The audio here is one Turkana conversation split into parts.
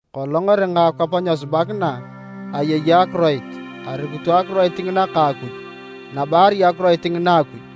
Kolong eringa akwap nyesubakina, ayei Akiroit, arukito Akiroit ngina ka Akuj, nabo arai Akiroit ngina Akuj.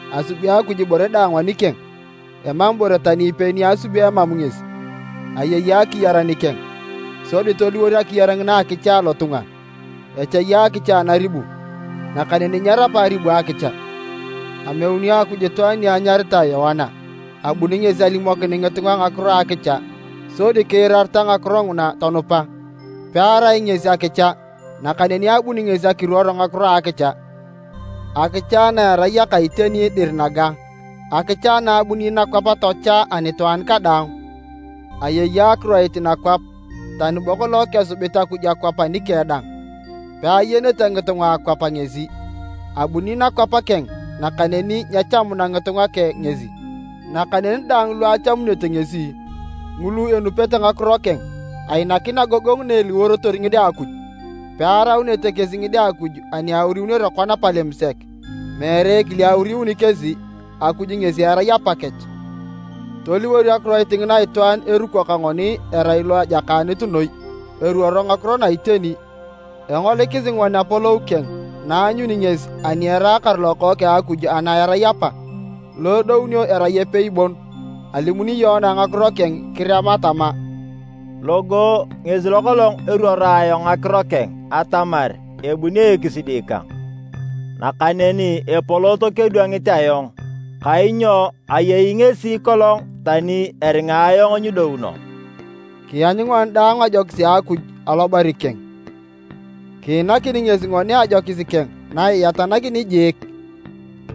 Asubi Akuj ibore daang anikeng, emam ibore tani ipei ni asubio emam ngesi. Ayei akiyar nikeng, sodi toliwor akiyar ngina akicha alotunga. Echai akicha anaribu nakaneni nyerapa aribu akicha. Ameuni Akuj itwaan ni anyaritae Yoana. Abuni ngesi alimokin ngitunga ngakiro a akicha, sodi kiirareta ngakiro nguna tonupa. Pearai ngesi akicha, nakaneni abuni ngesi akiruor ngakiro a akicha. Akicha na erai aka iteni dir naga, akicha na abuni nakwap tochaa anitwaan kadaang. Ayei Akiroit nakwap, tani bo kolong kesubit Akuj akwap anikeng dang, peayenete ngitunga a akwap ngesi. Abuni nakwap keng, nakaneni nyechamuna ngitunga keng ngesi. Nakaneni daang lu achamunete ngesi, ngulu enupete ngakiro keng, ainakin agogongu na eliworotor ngide a Akuj. Pearaunete kesi ngide a Akuj ani auriunere kona palem sek, meere ekile auriuni kesi, Akuj ngesi erai Apakech. Toliwor Akiroit ngina itwaan eruko ka ngoni erai lo ajakaanit noi eruoro ngakiro na iteni. Engolikisi ngoni apolou keng na aanyuni ngesi ani eraakar Lokookeng a Akuj ana erai Apa, lo edounio erai epei bon. Alimuni Yoana ngakiro keng kirema tama, “Logo ngesi lo kolong eruoro ayong ngakiro keng atamar ebuni ekisidi kang, nakaneni epolot kedwangit ayong, kainyo ayei ngesi kolong tani eringa ayong nyidouno.” Kianyu ngoni daang ajokis a Akuj alobari keng, kiinanakini ngesi ngoni ajokis keng na iyatanakin jiik.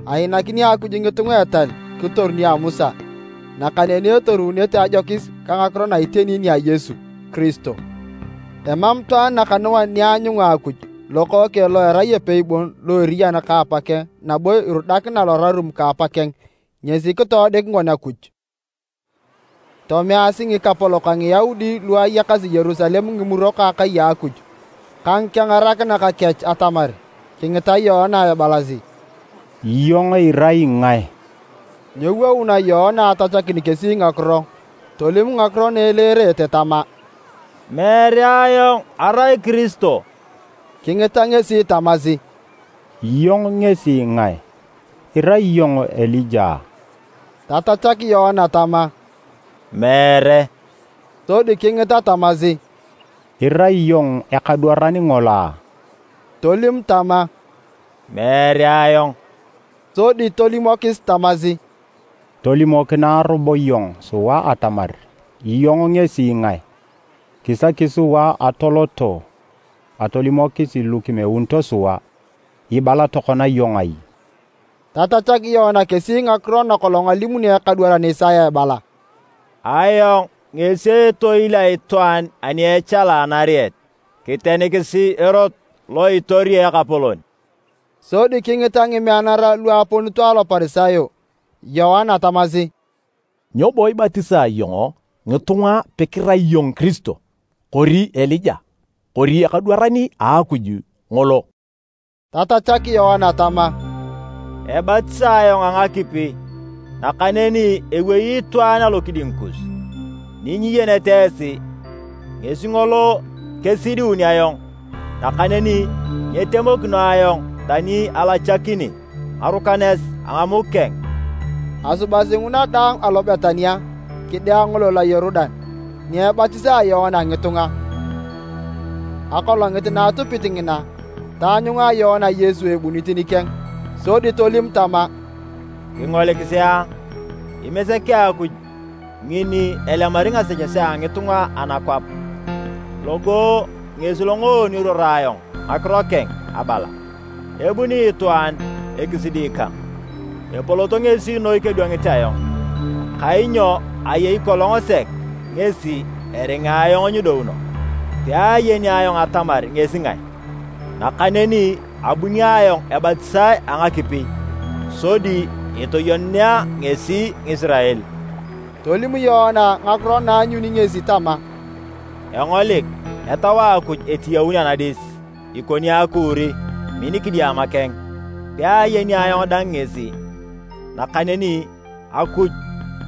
Ainakini Akuj ngitunga etal kitoru nia Musa, nakaneni etorunete ajokis ka ngakiro na iteni nia Yesu Kiristo. Emam itwaan nakanuan ni aanyunga Akuj, Lokookeng lo erai epei bon lo eriyan ka Apakeng nabo irudakina lorarum ka Apakeng, ngesi kitodik ngoni Akuj. Tomeasi ngikapolok a Ngiyaudi lu ayakasi Yerusalem ngimurok a akai a Akuj ka ngikengarakinak kech atamar kingita Yoana ebalasi, “Iyong irai ngae?” Nyewouna Yoana atachakin kesi ngakiro. Tolim ngakiro na eleerete tama, “Meere ayong arai Kiristo.” Kingita ngesi tamasi, “Iyong ngesi ngae? Irai iyong Elija a?” Tatachak Yoana tama, “Meere.” Sodi kingita tamasi, “Irai iyong ekadwaran ngolo a?” Tolim tama, “Meere ayong.” Sodi tolimokis tamasi, “Tolimokinae robo iyong sua atamar iyong ngesi ngae. Kisaki sua atoloto atolimokisi lu kimeunito sua. Ibala tokona iyong ai?” Tatachak Yoana kesi ngakiro nakolong alimuni ekadwaran Isaya ebala, “Ayong ngesi etoil a itwaan ani echala anariet, Kitenikisi erot lo itori Ekapolon!” Sodi kingita ngimeanara lu aponito Aloparisayo, Yoana tamasi, “Nyo bo ibatisa iyong ngitunga pekirai iyong Kiristo, kori Elija kori ekadwaran a Akuj ngolo?” Tatachak Yoana tama, “Ebatisae ayong a ngakipi, nakaneni ewei itwaan alokiding kus ni nyiyenete esi. Ngesi ngolo kesidiun ayong, nakaneni nyitemokino ayong tani alachakini ngarukanes a ngamuk keng.” Asubasi nguna daang alo Betania, kide angolol a Yorudan, ni ebatisaa Yoana ngitunga. Akolongit na atupit ngina, taanyunga Yoana Yesu ebunit nikeng. Sodi tolim tama, “Kingolikisi a! Imesek a Akuj ngin ni elemari ngasechesea a ngitunga anakwap! Logo ngesi longoon eruoro ayong ngakiro keng abala, ‘Ebuni itwaan ekisidi kang, epolot ngesi noi kedwangit ayong, kainyo ayei kolong sek ngesi eringa ayong nyidouno.’ Peayeni ayong atamar ngesi ngae, nakaneni abuni ayong ebatisae a ngakipi sodi eteyenunea ngesi Ngisirael.” Tolim Yoana ngakiro na aanyuni ngesi tama, “Engolik Etau a Akuj etiyaun anadis ikoni akuuri min kidiama keng. Peayeni ayong dang ngesi, nakaneni Akuj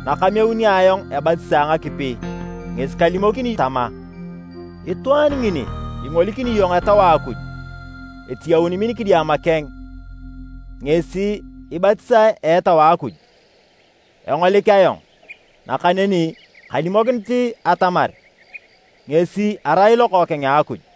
nakameuni ayong ebatisa a ngakipi, ngesi kalimokini tama, ‘Itwaan ni ingolikini iyong Etau a Akuj etiyaun min kidiama keng ngesi ibatisae a Etau a Akuj.’ Engolik ayong, nakaneni kalimokinit atamar ngesi erai Lokookeng a Akuj.”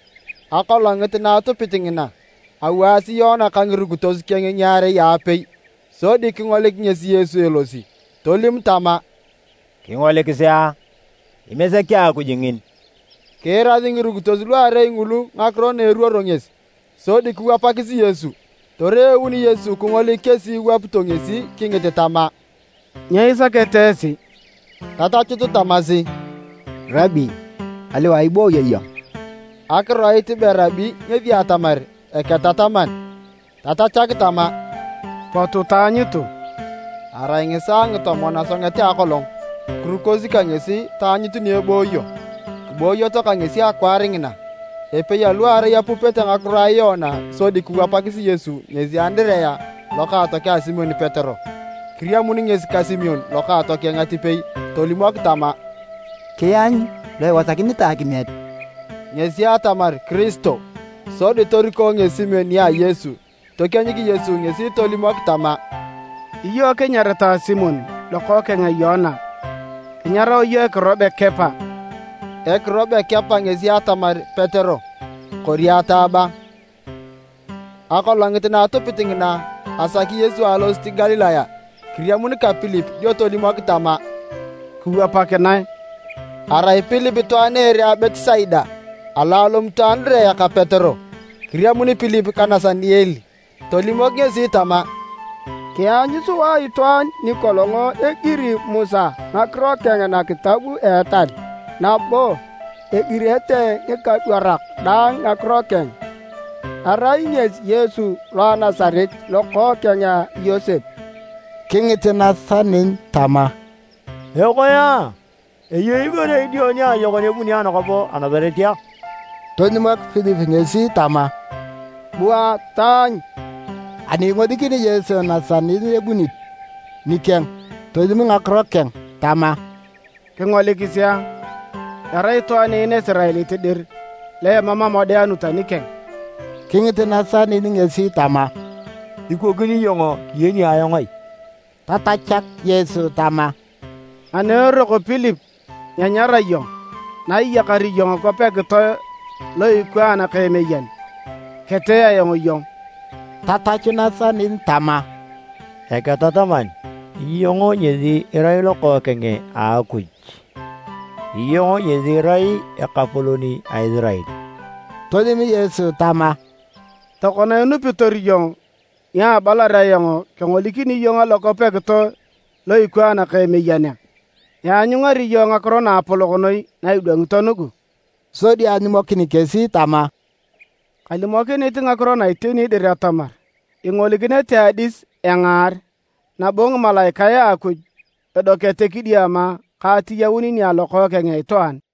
Akolongit na atupit ngina, awaasi Yoana ka ngirukitos keng ngiarei aapei. Sodi kingolik ngesi Yesu elosi, Tolim tama, “Kingolikisi a! Imesek a Akuj ngin.” Kiirasi ngirukitos luarei ngulu ngakiro na eruoro ngesi, sodi kiwapakis Yesu. Toreun Yesu kingolik kesi iwapito ngesi kingit tama, “Nyo isakete esi?” Tatachut tamasi, “Rabi, aliwae ibooyo iyong?” (Akiroit be Rabi ngesi atamar, “Eketataman”.) Tatachak tama, “Potu taanyutu.” (Arai ngisaae ngitomon a asonget a akolong.) Kirukosi ka ngesi taanyut ni ebooyo, kiboyoto ka ngesi akwaar ngina. Epei aluarei apupete ngakiro a Yoana sodi kiwapakis Yesu ngesi Andirea lokaatokeng a Simon Petero. Kiriamun ngesi ka Simon lokaatokeng atipei tolimok tama, “Kianyu lo iwasakinitae akimiet.” (Ngesi atamar, “Kiristo”.) Sodi toriko ngesi Simon nia Yesu. Tokienyik Yesu ngesi tolimok tama, “Iyong kinyaritae Simon lokookeng a Yoana, kinyarao iyong ekiro be Kepa.” (Ekiro be Kepa ngesi atamar Petero kori “ataaba”.) Akolongit na atupit ngina, asaki Yesu alosit Galilaya. Kiriamun ka Pilip dio tolimok tama, “Kiwapakinae!” ( Arai Pilip itwaan a ere a Betisaida, alo alomito Andirea ka Petero). Kiriamun Pilip ka Nasaniel tolimok ngesi tama, “Kianyu sua itwaan nikolong egiri Musa ngakiro keng nakitab a etal, nabo egirete ngikadwarak dang ngakiro keng. Erai ngesi Yesu, lo a Nasaret, lokookeng a Yosep.” Kingit Nasaniel tama, “Ekoe! Eyei ibore idio kajokon ebuni anakwap a Nasaret a?” Tolimok Pilip ngesi tama, “Bua taanyu.” Ani ingolikini Yesu Nasaniel ebunit nikeng tolim ngakiro keng tama, “Kingolikisi a! Erai itwaan en Isiraelit dir lo emam amodeanut anikeng!” Kingit Nasaniel ngesi tama, “Ikokini iyong kiyeni ayong ai?” Tatachak Yesu tama, “Ani eroko Pilip nyenyara iyong, na iyakar iyong kwap ekitoe lo ikwaan ka emeyan, ketee ayong iyong.” Tatachu Nasaniel tama, “Eketataman, iyong ngesi irai Lokookeng a Akuj! Iyong ngesi irai Ekapolon a Isirael!” Tolim Yesu tama, “Tokona inupitor iyong ni abalar ayong kengolikini iyong alokwap ekitoe lo ikwaan ka emeyan a? Ianyungari iyong ngakiro naapolok noi na idwangito nugu!” Sodi alimokin kesi tama, “Kalimokinit ngakiro na iteni dir atamar, ingolikinete adis engaar, nabo ngimalaikae a Akuj edokete kidiama ka atiyaun nia Lokookeng a Itwaan.”